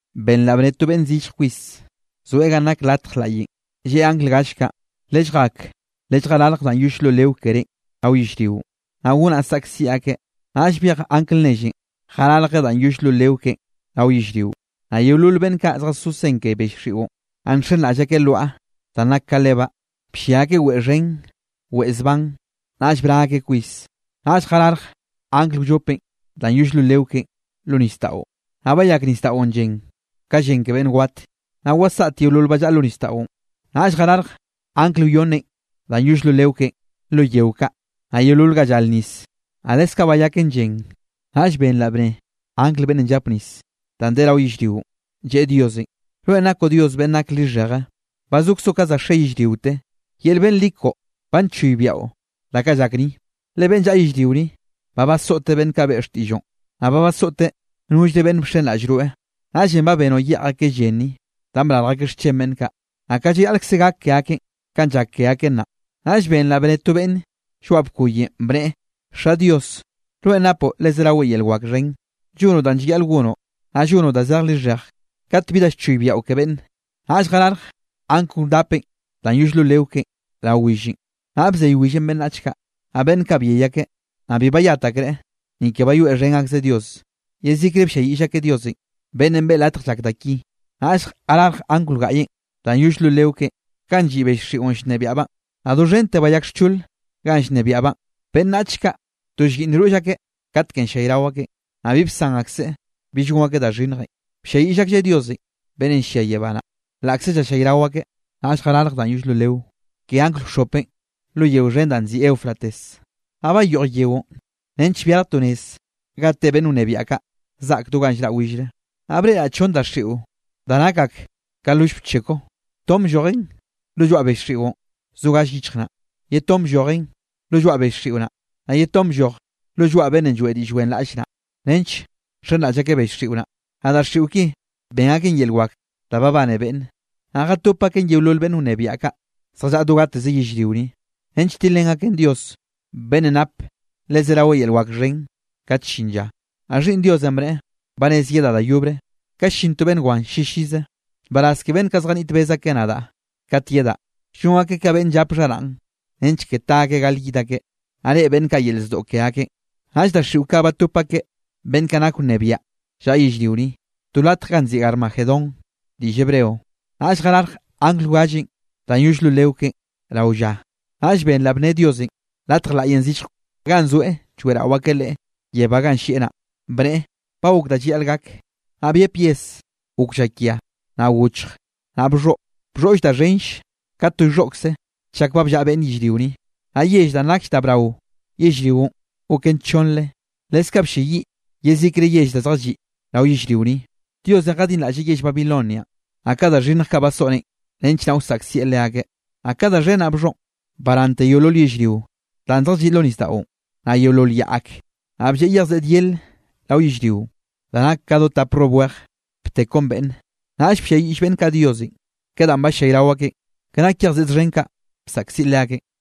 Benraꞌ bnne to beꞌnn zillj kwis, zoeꞌ ganꞌ nak latj laꞌyenꞌ, lleꞌe angl gall kaꞌ: —Lelljak lelljararje danꞌ yoll lo leo kerénꞌ rao yellrionꞌ, naꞌ gonaꞌ saꞌkziꞌ akeꞌ. Naꞌll byej angl nellenꞌ, jararjeꞌ danꞌ yoll lo leo keꞌen rao yellrio, naꞌ yeolol beꞌnn kaꞌ zjazó sen ke bell xiꞌon, naꞌ nxenraꞌll akeꞌ lwaꞌa danꞌ nak ka lebaꞌ, bllia akeꞌ weꞌe xhen weꞌe zban, naꞌll bra akeꞌ kwis. Naꞌll jararje angl wllopenꞌ danꞌ yoll lo leo keꞌen lo nisdaꞌon, naꞌ bayak nisdaꞌon llen ka llen ke beꞌnn wat, naꞌ wasaꞌt yeolol ba llaꞌa lo nisdaꞌon. Naꞌll jararje angl wyonnenꞌ danꞌ yoll lo leo keꞌen lo yeo kaꞌ, naꞌ yeolol ga llar nis, naꞌ leskaꞌ bayaken llen. Naꞌll benraꞌ bnne angl beꞌnnenꞌ llap nis danꞌ de rao yellrionꞌ, lleꞌe Diosenꞌ: —Rweꞌn nakoꞌ Dios beꞌnn nak lixheje, ba zokzoꞌ ka za xe yellriote, yel beꞌnn li koꞌo ba nchoybiaꞌo da kaꞌ llak ni. Le beꞌnn llaꞌa yellrio ni, ba basoꞌteꞌ beꞌnn kaꞌ beꞌe xtiꞌlloꞌn, naꞌ ba basoꞌteꞌ nollre beꞌnn bxenraꞌll rweꞌ. Naꞌllenꞌ ba benoꞌ yeꞌj akeꞌ llen ni, danꞌ brarj akeꞌ xchen beꞌnn kaꞌ. Naꞌ kaꞌ llayaꞌlkze gak ke akeꞌn kanꞌ llak ke akeꞌ nnaꞌ. Naꞌll benraꞌ bnne to beꞌnne lloaꞌ bkoyenꞌ, bneꞌe: —Xa Dios, rweꞌn napoꞌ le zerawe yel wak xhen, llonoꞌ danꞌ llayaꞌl gonoꞌ, naꞌ llonoꞌ da zej lixheje kat bi da llchoybiaꞌo ke beꞌnne. Naꞌll jararje angl wdapenꞌ danꞌ yoll lo leo keꞌen rao willenꞌ, naꞌ bzey willenꞌ beꞌnnach kaꞌ. Naꞌ beꞌnn kaꞌ byey akeꞌ, naꞌ bi bayat akreꞌ ni ke bayoeꞌxhen akzeꞌ Dios, yezikre blliayiꞌll akeꞌ Diosenꞌ, beꞌnnenꞌ beꞌe latje llak da ki. Naꞌll jararje angl wgaꞌyenꞌ danꞌ yoll lo leo keꞌen ganꞌ lliꞌ bell xiꞌon llnebiaꞌbaꞌn, naꞌ doxhente bayak xchol ganꞌ llnebiaꞌbaꞌn, beꞌnnach kaꞌ to llyiꞌnn roll akeꞌ katkenꞌ llallayrao akeꞌn. Naꞌ bi bsan akseꞌ bill gon akeꞌ da xhinnjenꞌ, blliayiꞌll aklleꞌ Diosenꞌ beꞌnnenꞌ llia yebá naꞌ, laꞌkze llallayrao akeꞌ. Naꞌll jararje danꞌ yoll lo leo ke angl wxhopenꞌ lo yeo xhen danꞌ nziꞌi Eufrates, naꞌ bayoꞌj yeonꞌ nench byarj to nez ga te beꞌnn wnebiaꞌ kaꞌ zaꞌk do ganꞌ llraꞌ willre. Naꞌ breꞌraꞌ chonn daxiꞌo da nak ak ka loll bcheko. Ton bllojen lo lloaꞌ bel xiꞌon zo gall yichj naꞌ, ye ton bllojen lo lloaꞌ bell xiꞌo naꞌ, naꞌ ye ton blloj lo lloaꞌ beꞌnnenꞌ lloeꞌ diꞌll wenraꞌll naꞌ, nench nxenraꞌll akeꞌ bell xiꞌo naꞌ. Naꞌ daxiꞌo ki ben aken yel wak da babane beꞌnne, naꞌ jatop aken yeolol beꞌnn wnebiaꞌ kaꞌ zjallaꞌa do gateze yellrio ni, nench tilrén akeꞌ Dios beꞌnnenꞌ nap le zerawe yel wak xhen kat llin lla. Naꞌ Xhiꞌnn Diosenꞌ bneꞌe: —Ba rez yedaꞌ da yobre, ka llin to beꞌnn wan llillize. Nbaraz ke beꞌnn kaꞌ zjaniꞌt bez akeꞌ nadaꞌ kat yedaꞌ, llon akeꞌ ka beꞌnn llap xharaꞌn, nench ke ta akeꞌ gal yid akeꞌ, naꞌ reꞌe beꞌnn kaꞌ yel zdoꞌ ke akeꞌn. Naꞌll daxiꞌo kaꞌ batop akeꞌ beꞌnn kaꞌ nak wnebiaꞌ llaꞌa yellrio ni, to latj ganꞌ nziꞌi Armagedón diꞌll Hebreo. Naꞌll jararj angl wgallenꞌ danꞌ yoll lo leo keꞌen rao lla, naꞌll benraꞌ bnne Diosenꞌ latj laꞌyenꞌ zillje, ganꞌ zoeꞌ lloeꞌrao akeꞌ Leꞌe yebá ganꞌ llieꞌ naꞌ, bneꞌe: —Ba gok da llayaꞌl gak. Naꞌ byep yes, gok llakia, naꞌ gochj, naꞌ bxhoꞌ. Bxhoꞌlle da xhenll ka to llxhoꞌkze chak ba bllaꞌa beꞌnn yellrio ni. Naꞌ yell danꞌ nakll da brao yellrionꞌ goken chonnre, leskaꞌ blleyiꞌ yezikre yell da zjalliꞌ rao yellrio ni. Diosenꞌ jadinraꞌlleꞌ yell Babilonianꞌ, naꞌ ka da xhinnj kaꞌ basoꞌneꞌ nench naꞌ wsaꞌkzieꞌ leakeꞌ. Naꞌ ka da xhen naꞌ bxhoꞌn, barante yeolol yellrio danꞌ zjalliꞌ lo nisdaꞌon, naꞌ yeolol yaꞌ ak. Naꞌ blleꞌ yej seꞌd yele rao yellrionꞌ, da nak ka do tap rrob wej btekon beꞌnne. Naꞌll blliayiꞌll beꞌnn kaꞌ Diosenꞌ ke danꞌ ballayrao akeꞌn, ke nak yej seꞌd xhen kaꞌ bsaꞌkziꞌ leakeꞌn.